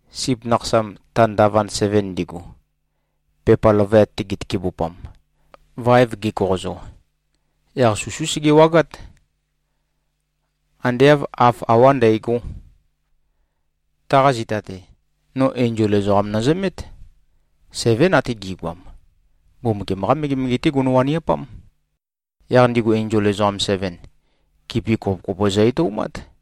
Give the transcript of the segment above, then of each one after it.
Sip Nakhasam, ta ndavand seven ndigu, pepa løvøyat-te gitøkebupam, vaev gekoqozo, yaq susú sege-wagát. Ande āv haf awá ndægó. Taqa zita-te, no enzol ezoqam nøzømét. Sevén ate gi꞉goam. Mbumbukiam-qá megemege-té gono-waniapám. Yaq ndigu enzol ezoqam seven, kipi kopo-kopo zø-etoumát.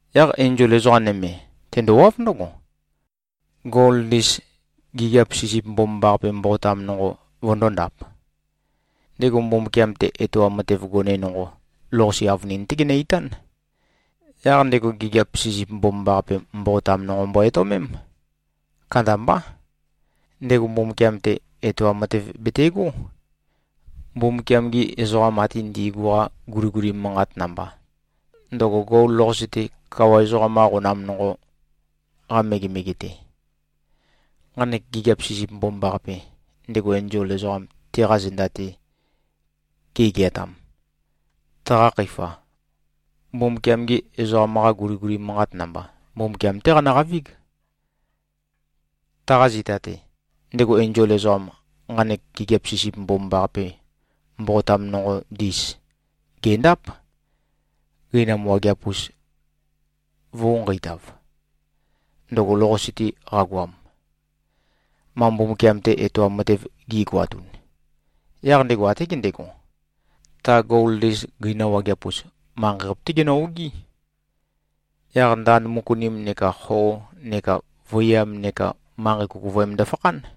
Yaq enzol ezoqa nøme, tendowáv ndǿgo, gol ndis, gigiap sisip mbomambaqape mboqotam nonqo, vøndōndap. Ndego Mbumbukiam-te etoam matev gone nonqo lou-qase avønin-té genø-itán. Yaq ndego gigiap sisip mbomambaqape mboqotam nonqo mbo-etøomém. Kandambá. Ndego Mbumbukiam-te, etoam matev betegó, Mbumbukiam-gi ezoqam ate ndi꞉gu-qa guliguli manqat namba, ndøgo gol lou-qase-te, kawa ezoqam-qa qonam nonqo-qa megemege-te. Nqanek gigiap sisip mbomambaqape, ndego enzol ezoqam teqa zenda ge꞉geatam, taqa khøifa, Mbumbukiam-gi ezoqam-qa guliguli manqat namba, Mbumbukiam-té qanøqavíg. Taqa zita-te, ndego enzol ezoqam, nqanek gigiap sisip mbomambaqape mboqotam nonqo ndis, gèndáp, gøinam wageap-us vø̄u-nqeitav, ndøgo lou-qase-te qagoam, ma Mbumbukiam-te etoam matev gi꞉goatun. Yaq ndego até gendego, ta gol ndis gøina wageap-us, manqei-qape-té genø-ogí. Yaq ndand møkunim neka xo neka vøiyam neka manqei kukuvøem ndøfakhán.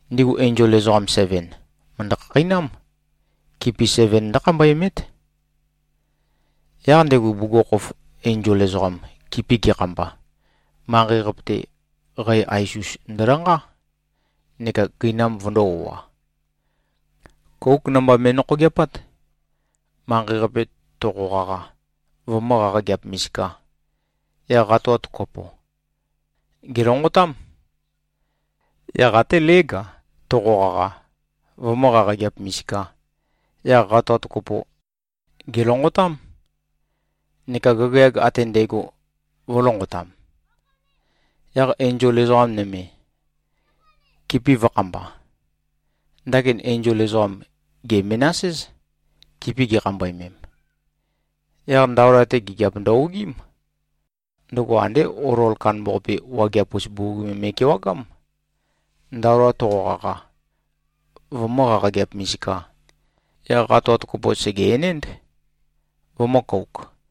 Ndigu enzol ezoqam seven, mø̀ndø-khakheinám. Kipi seven ndǿkhambøemét. Yaq ndego bugukhokhof enzol ezoqam kipi gekhamba, manqei-qape-te qæ ais-us ndølanqá neka gøinam vøndō-o꞉a. Kóuk namba me꞉nokhogeapát. Manqei-qape toqo-qaqa, vømǿ-qaqageap-misikā, yaq qatoat kopo, gèlonqotám. Yaq até lég-a, toqo-qaqa, vømǿ-qaqageap-misikā, yaq qatoat kopo, gèlonqotám. Neka gagayag ate ndægo vø̄lonqotam. Yaq enzol ezoqa nøme, kipi vø̄khamba. Ndakin enzol ezoqam, gè-menas-éz, kipi gikhambøemem. Yaq ndaola-te, gigiap ndø-ogiím. Ndøgo andé olol kandambaqape wageap-us bugug me me꞉kewagám. Ndaola toqo-qaqa, vømǿ-qaqageap-misikā, yaq qatoat kopo sège-enénd, vømø̄-kouk.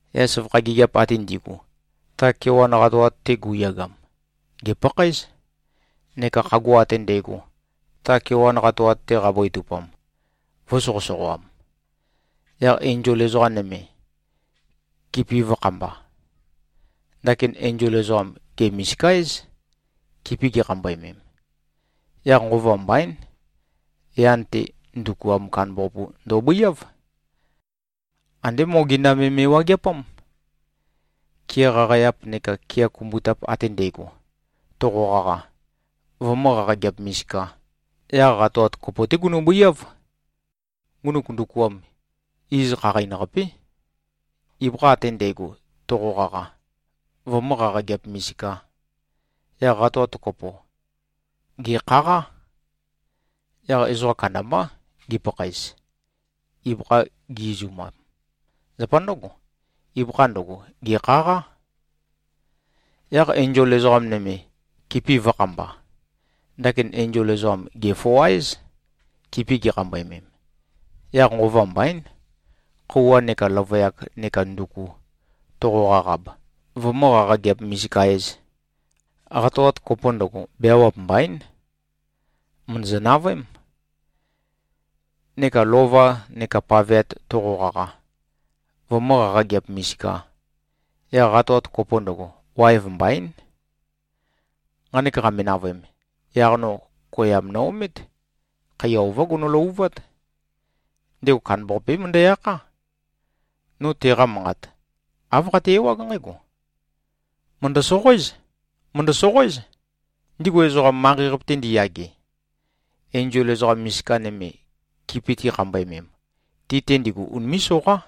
Yaq søvakha gigiap ate ndi꞉gu, ta kewan qatoat-te gu꞉yagam, gèpakhaéz, neka khagua ate ndægo, ta kewan qatoat-te qabøetupam, vø̄soqøsoqoam. Yaq enzol ezoqa nøme, kipi vø̄khamba. Ndakin enzol ezoqam, gè-misika-éz, kipi gikhambøemem. Yaq nqova mbaín, yan-te, ndukuam kandambaqapu ndobøiáv. Andé mogenda me me꞉wageapám. Kea qaqæap neka kea kumbutap ate ndægo, toqo-qaqa, vømǿ-qaqageap-misikā, yaq qatoat kopo-té gunø-bøiáv. Ngunuk ndukuam, iz Khaqain-Qapé. Ibøkha ate ndægo, toqo-qaqa, vømǿ-qaqageap-misikā, yaq qatoat kopo, gèkhaqá. Yaq ezoqa kandambá, gipakhaez, ibøkha gi-izumam. Zapa ndǿgo, ibøkha ndøgo, gèkhaqá. Yaq enzol ezoqa nøme, kipi vø̄khamba. Ndakin enzol ezoqam, gè-foa-éz, kipi gikhambøemem. Yaq nqova mbaín, khøuwa neka løvøyak neka nduku toqo-qaqab, vømǿ-qaqageap-misika-ēz, qatoat kopo ndøgo, beawap mbaín. Mø̀ndøzø-navøém. Neka lova neka paveat toqo-qaqa, vømǿ-qaqageap-misikā, yaq qatoat kopo ndøgo, waev mbaín. Nqanek qame-navøem, yaq no koyam no-omét. Khaiya ová gono-løvuvát. Ndego kandambaqapé møndæ-akhá. No teqa manqat, āv qate-ewág nqǽgo, “Mø̀ndø-soqoéz. Mø̀ndø-soqoéz, ndigu ezoqam, manqei-qape-te ndiyage, enzol ezoqa misika nøme, kipi tikhambøemem. Ti-te ndigu, unimé꞉-soqá.”